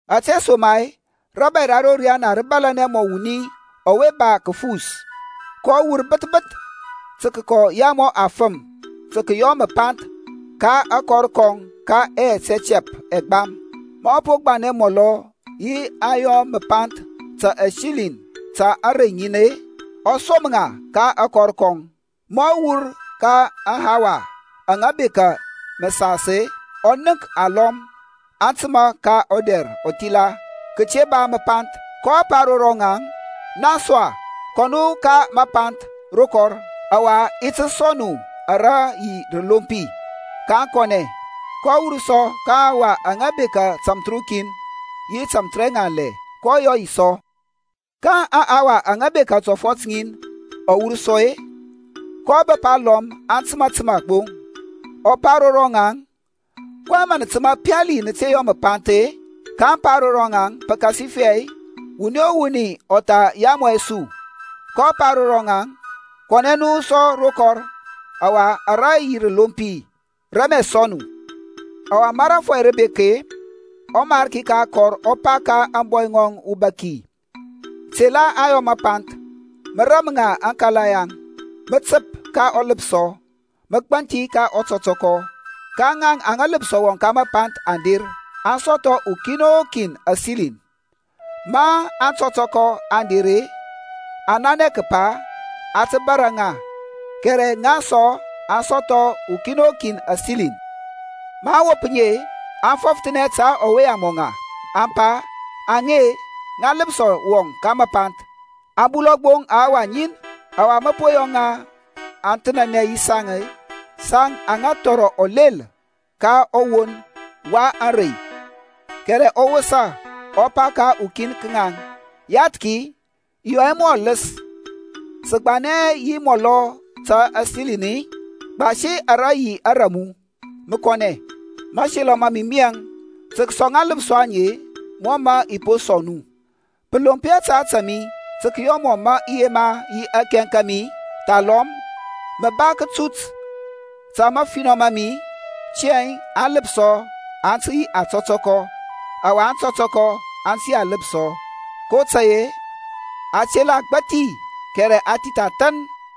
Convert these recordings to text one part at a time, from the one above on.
Ȧtesoma-e rȧbȧy ra ro riyana rǝ bȧlȧnɛ mɔ wuni ɔwe ba kǝfus, kɔ wur bǝth bǝth tǝ kǝyamɔ afǝm tǝ kǝyɔ mǝpanth ka akɔr kɔŋ ka yɛt ɛtɛp ɛgbam. Ma ɔ po gbanɛ mɔlɔ yi aŋyɔ mǝpanth ta asiliŋ ta arey ŋin-e, ɔ som ŋa ka akɔr kɔŋ. Ma ɔ wur ka aŋhawa aŋa bekȧ mǝsas-e, ɔ nənk alɔm aŋ tǝma ka ɔdɛr ɔthila kǝte ba mǝpanth. kɔ pa ro rɔŋaŋ, Naŋ sɔ-e, kɔ nu ka mapanth ro kɔr, ɔwa i ti sɔŋ nu ara yi rǝlompi. Kaŋ kɔnɛ. kɔ wur sɔ ka aŋhawa aŋa bekȧ tamthǝrukin yi tamthǝrɛŋanlɛ, kɔ yɔ yi sɔ. Ka aŋhawa aŋa bekȧ tɔfɔt ŋin, ɔ wur sɔ-e, kɔ bǝp alɔm aŋ tǝma tǝma gbo, ɔ pa ro ŋaŋ, kɔyɛŋ mǝ nǝ tǝma nɔ pali nǝ te yɔ mǝpanth-e? kaŋ pa ro ŋɔŋ, Pǝkasifɛ wuni o wuni ɔ tha yamɔ hɛ su. Kɔ pa ro ŋaŋ, Kɔnɛ nu sɔ ro kɔr, ɔwa ara yi rǝlompi, rǝ i ti sɔŋ nu. Ɔwa ma rȧfɔy rǝ bek-e, ɔmarki ka akɔr ɔ pa ka ȧŋbɔy ŋɔŋ ubaki, Tela aŋyɔ mǝpanth, mǝ ram ŋa aŋkala ŋaŋ, mǝ tǝp ka ɔlǝpsɔ mǝ gbanthi ka ɔtɔtɔkɔ. Ka ŋaŋ aŋa lǝpsɔ wɔŋ ka mapanth aŋ der, aŋ sɔthɔ ukin o kin asiliŋ. Ma aŋtɔtɔkɔ aŋ der-e, aŋ nanɛ kǝpa a tǝ bȧrȧ ŋa, kɛrɛ ŋaŋ sɔ aŋ sɔthɔ ukin o kin asiliŋ. Maŋ wop ŋi-e, aŋ fɔfthənɛ ta ɔwe yamɔ ŋa, aŋ pa, Aŋe-e, ŋa lǝpsɔ wɔŋ ka mapanth, aŋ bulɔ gbo ahawa ŋin. Ɔwa mǝ po yɔ ŋa aŋ thǝnanɛ yi saŋ-e, saŋ aŋa thɔrɔ ɔlel ka ɔwon wa ȧŋrey. Kɛrɛ ɔ wosa, ɔ pa ka ukin ka ŋaŋ, Yathki, i yɔ hɛ mu ɔlǝs. Sǝ gbanɛ hɛ yi munɔ ta asiliŋ-i? Gbasi ara yi ara mu, mǝ kɔnɛ. Mȧselɔ ma mi miyɛŋ tǝ kǝsɔŋ aŋlǝpsɔ aŋe mɔ mǝ i po sɔŋ mu. Pǝ lomp hɛ ta ȧtȧ mi tǝ kǝyɔ mɔ mǝ i yema yi akɛŋ ka mi-i? thalɔm mǝ ba kǝtut ta mafinɔ ma mi-i? Tiyȧŋ aŋlǝpsɔ aŋ tǝ yi ȧtɔtɔkɔ ɔwa aŋtɔtɔkɔ aŋ tǝ yi alǝpsɔ. Kotȧy-e a tela agbȧthi, kɛrɛ a thith athȧn.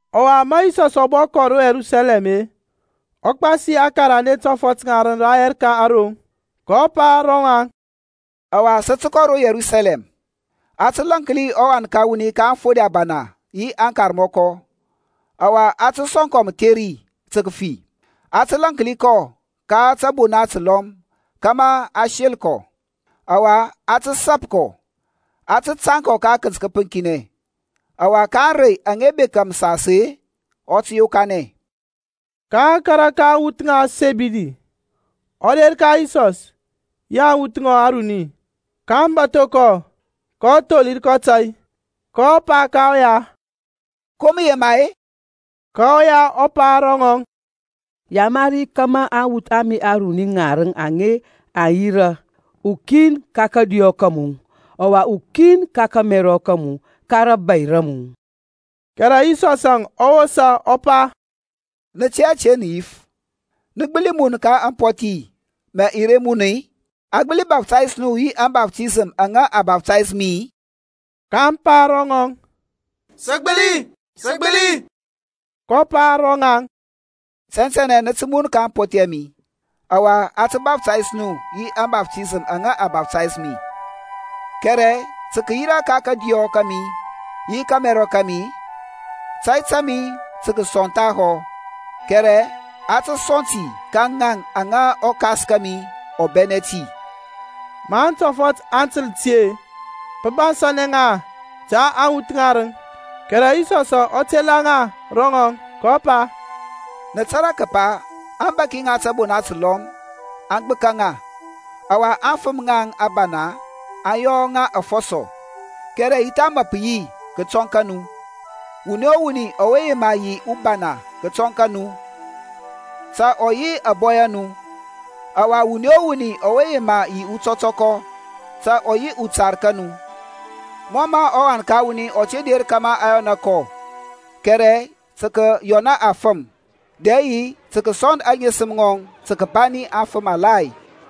Ɔwa ma Yisɔsȧŋ ɔ bɔ kɔ ro Yerusalɛm-e, ɔ gbasi aŋkarande tɔfɔt ŋarǝŋ rayɛr ka aroŋ, kɔ pa ro ŋaŋ, Ɔwa sǝ kɔ ro Yerusalɛm. A tǝ lȧnki ɔWan ka wuni ka aŋfode ȧbana yi aŋkarmɔkɔ ɔwa a tǝ sɔŋ kɔ mǝtheri tǝ kǝfi. Aŋ tǝ lȧnki kɔ ka tȧbona tǝlɔm kȧmȧ aŋ sel kɔ, ɔwa aŋ tǝ sap kɔ, aŋ tǝ tȧŋ kɔ ka kǝnt kǝpǝŋkinɛ. Ɔwa ka ȧŋrey aŋa bekȧ mǝsas-e, ɔ tǝ yokanɛ. Ka ɔkara ka aŋwuth ŋa Sɛbidi ɔ der ka Yisɔs yi aŋwuth ŋɔŋ aruni, kaŋ bȧtho kɔ, kɔ tholir kɔ tȧy. kɔ pa ka ɔya, Ko mǝ yema-e? Ka ɔya ɔ pa ro ŋɔŋ, Yamari kȧmȧ aŋwuth a mi aruni ŋarǝŋ aŋe aŋ yirȧ, ukin ka kȧdiyɔ ka mu, ɔwa ukin ka kȧmɛrɔ ka mu ka rȧbȧy ra mu. Kɛrɛ Yisɔsȧŋ ɔ wosa ɔ pa, Nǝ tɛ hɛ ȧte nǝ yif. Nǝ gbǝli mun ka ampɔthi mǝ i re mun-i? A gbǝli baftays nu yi ȧŋbaftisəm aŋa a baftays mi-i? kaŋ pa ro ŋɔŋ, Sǝ gbǝli. kɔ pa ro ŋaŋ, Tɛntɛnɛ nǝ tǝ mun ka ampɔthi a mi, ɔwa a tǝ baftays nu yi ȧŋbaftisəm aŋa a baftays mi. Kɛrɛ tǝ kǝyira ka kȧdiyɔ kȧmi yi ka kȧmɛrɔ ka mi-e, tȧy ta mi tǝ kǝsɔŋ thahɔ, kɛrɛ a tǝ sɔŋ ti ka ŋaŋ ta aŋa ɔKas kȧmi ɔ bɛnɛ ti. Ma aŋtɔfɔt aŋ tǝl ti-e, pǝ bansȧnɛ ŋa ta aŋwɔnt ŋarǝŋ. Kɛrɛ Yisɔs ɔ tela ŋa ro ŋɔŋ, kɔ pa, Nǝ tȧrȧ kǝpa aŋbȧki ŋa tȧbona tǝlɔm aŋ gbǝka ŋa, ɔwa aŋfǝm ŋaŋ ȧbana aŋ yɔ ŋa afɔsɔ. Kɛrɛ ya tha mǝ pǝ yi kǝtɔŋ ka nu. Wuni o wuni ɔwe yema yi ubana kǝtɔŋ ka nu, ta ɔ yi ȧbɔy a nu. Ɔwa wuni o wuni ɔwe yema yi utɔtɔkɔ, ta ɔ yi utar ka nu; mɔ mǝ ɔWan ka wuni ɔ te der kȧmȧ a yɔna kɔ, kɛrɛ tǝ kǝyɔna afǝm, dɛ yi tǝ kǝsɔnd aŋesǝm ŋɔŋ tǝ kǝbani afǝm alai.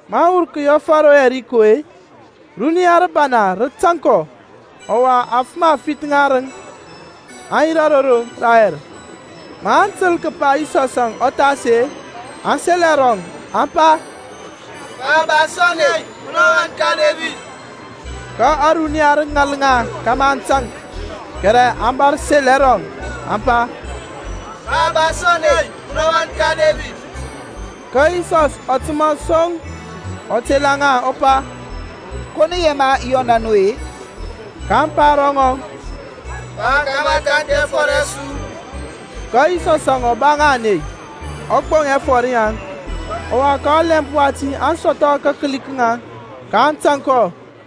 Maŋ wur kǝyɛfǝ ro Yɛriko-e, runiya rǝbana rǝ tȧŋ kɔ. Ɔwa afǝm afith ŋarǝŋ aŋ yirȧ ro roŋ rayɛr, ma aŋ tǝl kǝpa Yisɔsȧŋ ɔ thas-e, aŋ sel ɛrɔŋ, aŋ pa, Pa, ba su ȧney, munɔ ɔwan ka Debid. Ka ȧruniya rǝ ŋal ŋa kȧmȧ aŋ taŋk, kɛrɛ aŋ bȧr sel ɛrɔŋ, aŋ pa, Pa, ba su ȧney, munɔ ɔwan ka Debid. Ka Yisɔs ɔ tǝma son, ɔ tela ŋa ɔ pa, Ko nǝ yema i yɔna nu-e? kaŋ pa ro ŋɔŋ, Pa, kȧmȧ a kanthi ɛfɔr ɛ su. Ka Yisɔsȧŋ ɔ ba ŋa ȧney, ɔ gboŋ ɛfɔr yaŋ. Ɔwa ka ɔlɛmp wati aŋ sɔthɔ kakǝli ka ŋaŋ, kaŋ tȧŋ kɔ.